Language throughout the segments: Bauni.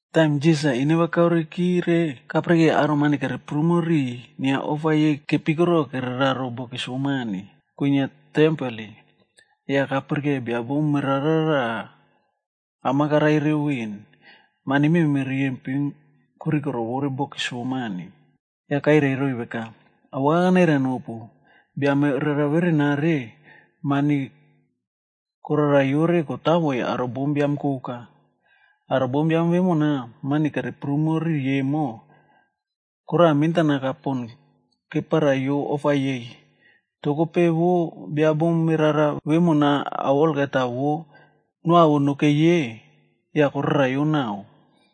Taim Jisas-a ineva kaorekire, kapirikei aro mani kere prumo riꞌiy inia ofa yei kepikoro kereraro bokis vo mania kwinia tempel. Yah kapirike bia bom merara raꞌa am-a karai reu veꞌen. Konoi mani mememe riyempin pon korikorovo bokis vo mani. Yah kairai roiy veka, “Awaka kanairai nopu, bia merara verenare, mani korikorovo kotavoiy aro bombiam koka. Aro bombiam vemona mani kereprumo riꞌiy emo, koraꞌa mentanaka pon keparaiyo ofa yei. Toh kope, vo bia bom merara vemona ao olgeta vo noawo nokei ye, yah koraraiyo naꞌao.”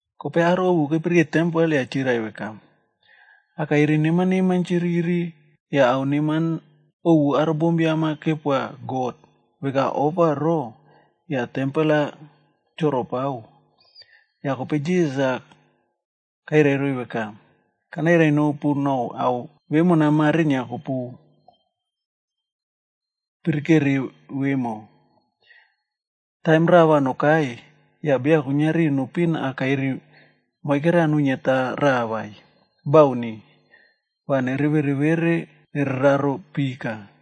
Kope aro ovu kepirikeu tempel yah chirai veka, “Akairi neman neman chiriri yah ao neman ovu aro bombiam-a kepoa God veka ofa ro, yah tempel-a choropao.” Yah kope Jisas-a kairai roiy veka, “Kanairai nopu nou ao vemona mare inia kopu pirikere vemo, taim raꞌa va nokai, yah beya kuiniari nepiꞌin akairib moike raꞌa nuiniata raꞌa vai. Bauni. Va nevere vere nere raro pika.”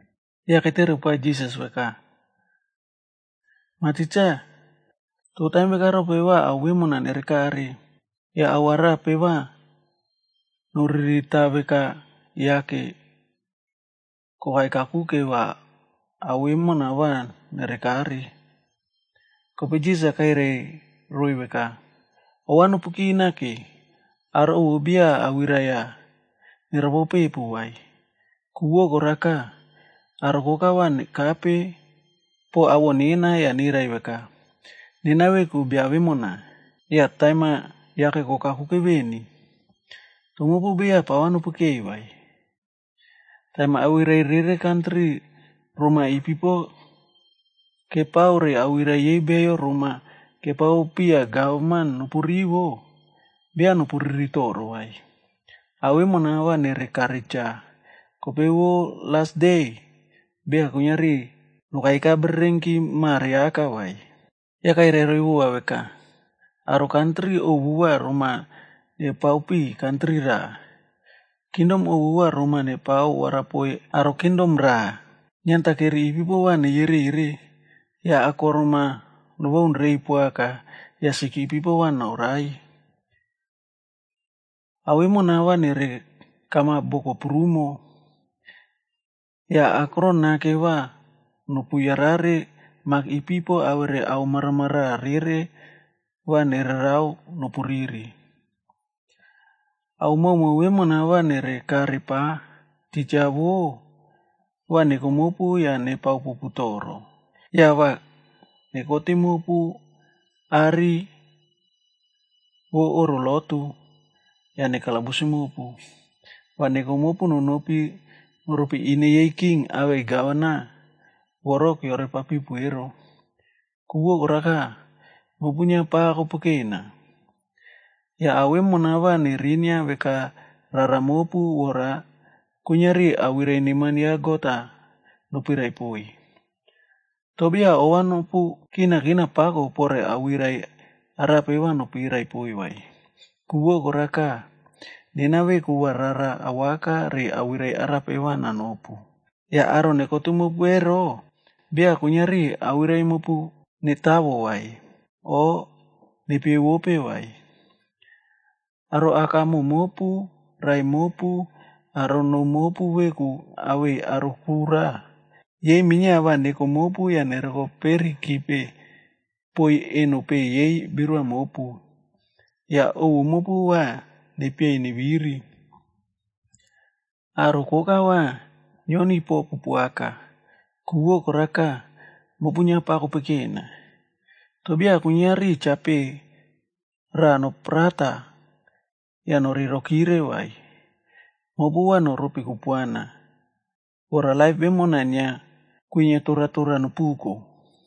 Yah ketere poa Jisas veka, “Mah Tikse, toh taim veka rope va ao vemona nere kare? Yah ao arape va noririta veka yake kokai kakuke va ao vemo va nere kare?” Kope Jisas-a kairai roiy veka, “Ova nopukina ke, aro ovu beya awirai-a neropopepu vai. Ku vo koraka, aro koka va nekape poꞌo awoꞌo nena yah nirai veka, ‘Nena veku bia vemona,’ yah ‘Taim-a yake kokakuke veni.’ Toh mopu beya pava nopekeiy vai. Taim awirai rere kantri roma ipipo kepao re awirai yei beyo roma kepao piya gavman nopu rivo, beya nopu riri toro vai. Ao vemona va nere kare cha, kope vo las de, beya kuiniari nokaika bererenki mare aka vai.” Yah kairai roiy vova veka, “Aro kantri ovu va roma nepao piꞌiy kantri raꞌa. Kingdom ovu va roma nepao varapoiy aro kingdom raꞌa. Niantakeri ipipo va neyerere, yah boko ovu va akorom-a nobaun reiy poaka yah sik ipipo va noraiy. Ao vemona va nere kamap boko prumo. Yah akron nake va nopu yarare mak ipipo awere ao maramaraꞌa vou va nererao nopu riri. “Ao maomao vemona va nere kare pa, titja vo va neko mopu yah nepao popu toro. Yah va nekotim mopu are vo oꞌro lotu, yah nekalabusim mopu. Va neko mopu nonopi noropi ine yei king awei gavana voro keore papiꞌi ero, ku vo koraka, mopu inia pava kopekena. Yah ao vemona va nerinia veka rara mopu vora kuiniari awirai neman ya God-a nopirai poiy. Toh beya ova nopu kinakina pako pore awirai arape va nopirai poiy vai. Ku vo koraka, nena veku va ruru awaka re awirai arape va nanopu. Yah aro nekotim mopu ero, beya kuiniari awirai mopu netavo vai, o nepievope vai. Aro akamoꞌo mopu, raꞌai mopu, aro noo mopu veku awei aro kura, yei minia va neko mopu yah neroko perikipe poiy eno peꞌe yei birua mopu. Yah ovu mopu va nepieiy neviri. Aro koka va nioniy popu poaka, ku vo koraka, mopu inia pava kopekena. Toh beya kuiniari cha peꞌe rava noprata yah norei rokire vai.c Mopu va noropi kupuana, vora laip vemona inia kwinia toratora nopuko.”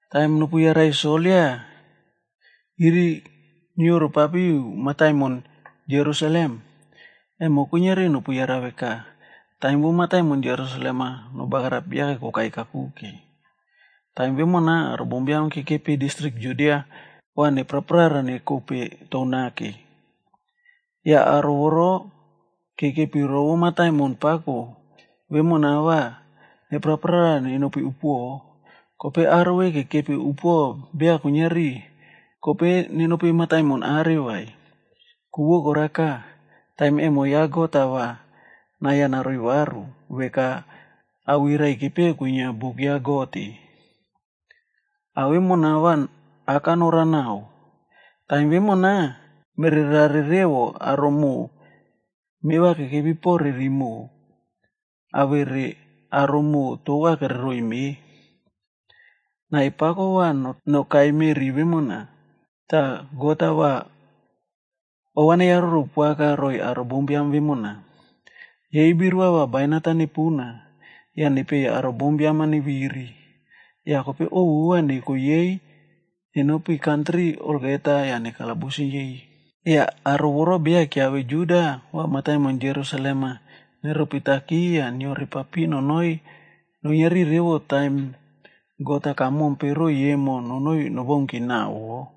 “Taim nopuyarai soldia iriniorokapari mataimon Jerusalem, va nopusave veka taim yei kepao mataimon Jerusalem-a nebagarapim, yake inia kokai kakuke. Taim vemona aro bombiam kekepi distrik Judia va neparara nekope tou nake. Yah aro voro kekepi rovope mataimon pako vemona va nepraprara nenopi upuoꞌo, kope aro ve kekepi upuoꞌo beya kuiniari kope nenopi mataimon are vai. Ku vo koraka, taim emo ya God-a va nai-a naroiy varu, veka awirai-a kepeꞌe kwinia buk ya God-e. Ao vemona va aka norao naꞌao. Taim vemo, mererare revo aro moꞌo meva kekepi pore rimoꞌo awere aro moꞌo tova kereriꞌiy me. Nai pako va nokaita meꞌri vemona, tah God-a va ova neyaroro poaka roiy aro bombiam vemona. Yei birua va bainat-a nepuna yah nepieiy aro bombiam-a neviri, yah kope ovu va neko yei nenopi kantri olgeta yah nekalabusim yei. Yah aro voro beya keave Juda va mataimon Jerusalem-a neropitaki yah neore papiꞌi nonoi nuiniari revo taim God-a kamompe roiy emo nonoi nobaunki naꞌao wo.”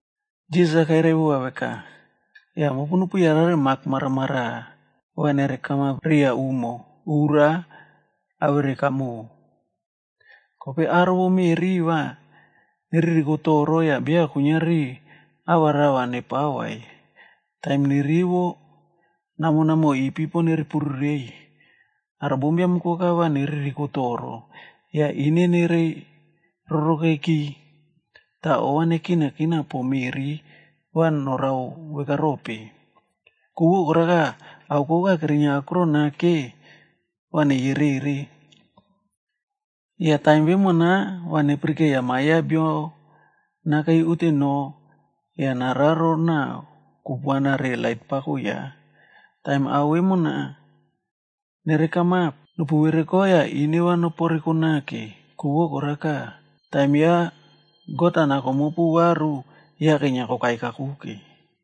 Jisas-a kairai vova veka, “Yah nopu yarare mak maramaraꞌa va nere kamap riya umo, ura, awere kamoꞌo. Kope aro vo meꞌri va neririko toro yah beya kuiniari ava rava nepao vai, taim nerivo namonamoꞌo ipipo nere pururei. Aro bombiam koka va neririko toro yah ine nereiy rorokeki, tah ova nekinakina poꞌo meꞌri va norao veka rope. Ku vo koraka, ao kupuana koka kerinia akron nake va neyerere. Yah taim vemona va nepirikeiya Ma Biam ya Bio nakei unteno yah nararo naꞌa kupuana re lait pako ya. Taim ao vemona nere kamap, nopu vereko yah ineva noporeko nake, ku vo koraka, taim ya God-a nako mopu varu yake inia kokai kakuke.”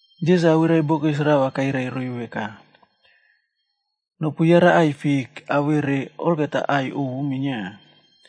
Jisas awirai bokis rava kairai roiy veka, “Nopuyara aꞌai fik awere aꞌai koka ovu minia.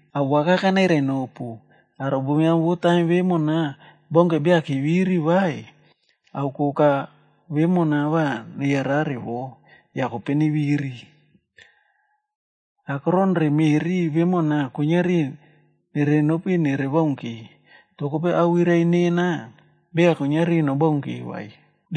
“Awaka kanairai nopu, aro bombiam vo taim vemona baunke beya keviri vai, ao koka vemona va neyarare wo, yah kope neviri. Akoron re meꞌri vemona kuiniari nerenopi nerebaunki, toh kope awirai nena beya kuiniari nobaunki vai.”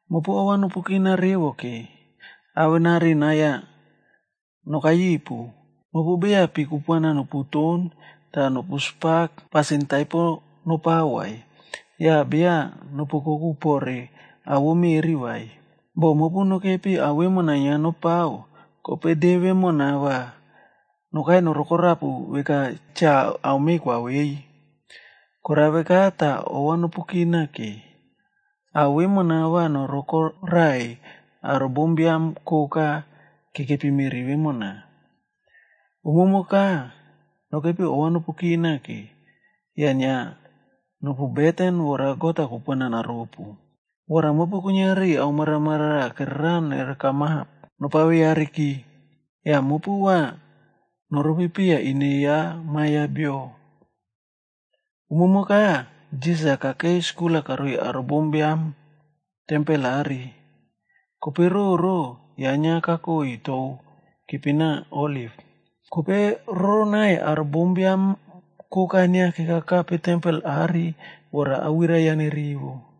“Mopu ovanopukina revo ke, avenari nai-a nokai ripu. Mopu beya pi kupuana noputon tah nopu spak yah pasin taipo nopao vai, yah beya nopu oukoku pore ao vo meꞌri vai. Boh mopu nokepi ao vemona inia nopao, kope de vemona va nokai norokorapu veka chao ame kwavei. Korao veka tah ova nopu kinake, ao vemona va noroko raꞌaiy aro bombiam koka kekepi meꞌri vemona. Umumoka, nokepi ova nopukina ke, yah inia nopu beten vora God-a kupuana naropu, vora mopu kuiniari ao maramaraꞌa kererao nere kamap nopaveyareki. Yah mopu va noropi piya ine ya Ma Biam ya Bio.” Umumoka, Jisas-a kakei skul-a karoiy aro bombiam tempel are. Kope roro, ya inia kakoi tou kepina Oliv. Kope roronai aro bombiam koka inia kekakape tempel are vora awirai ya nerivo.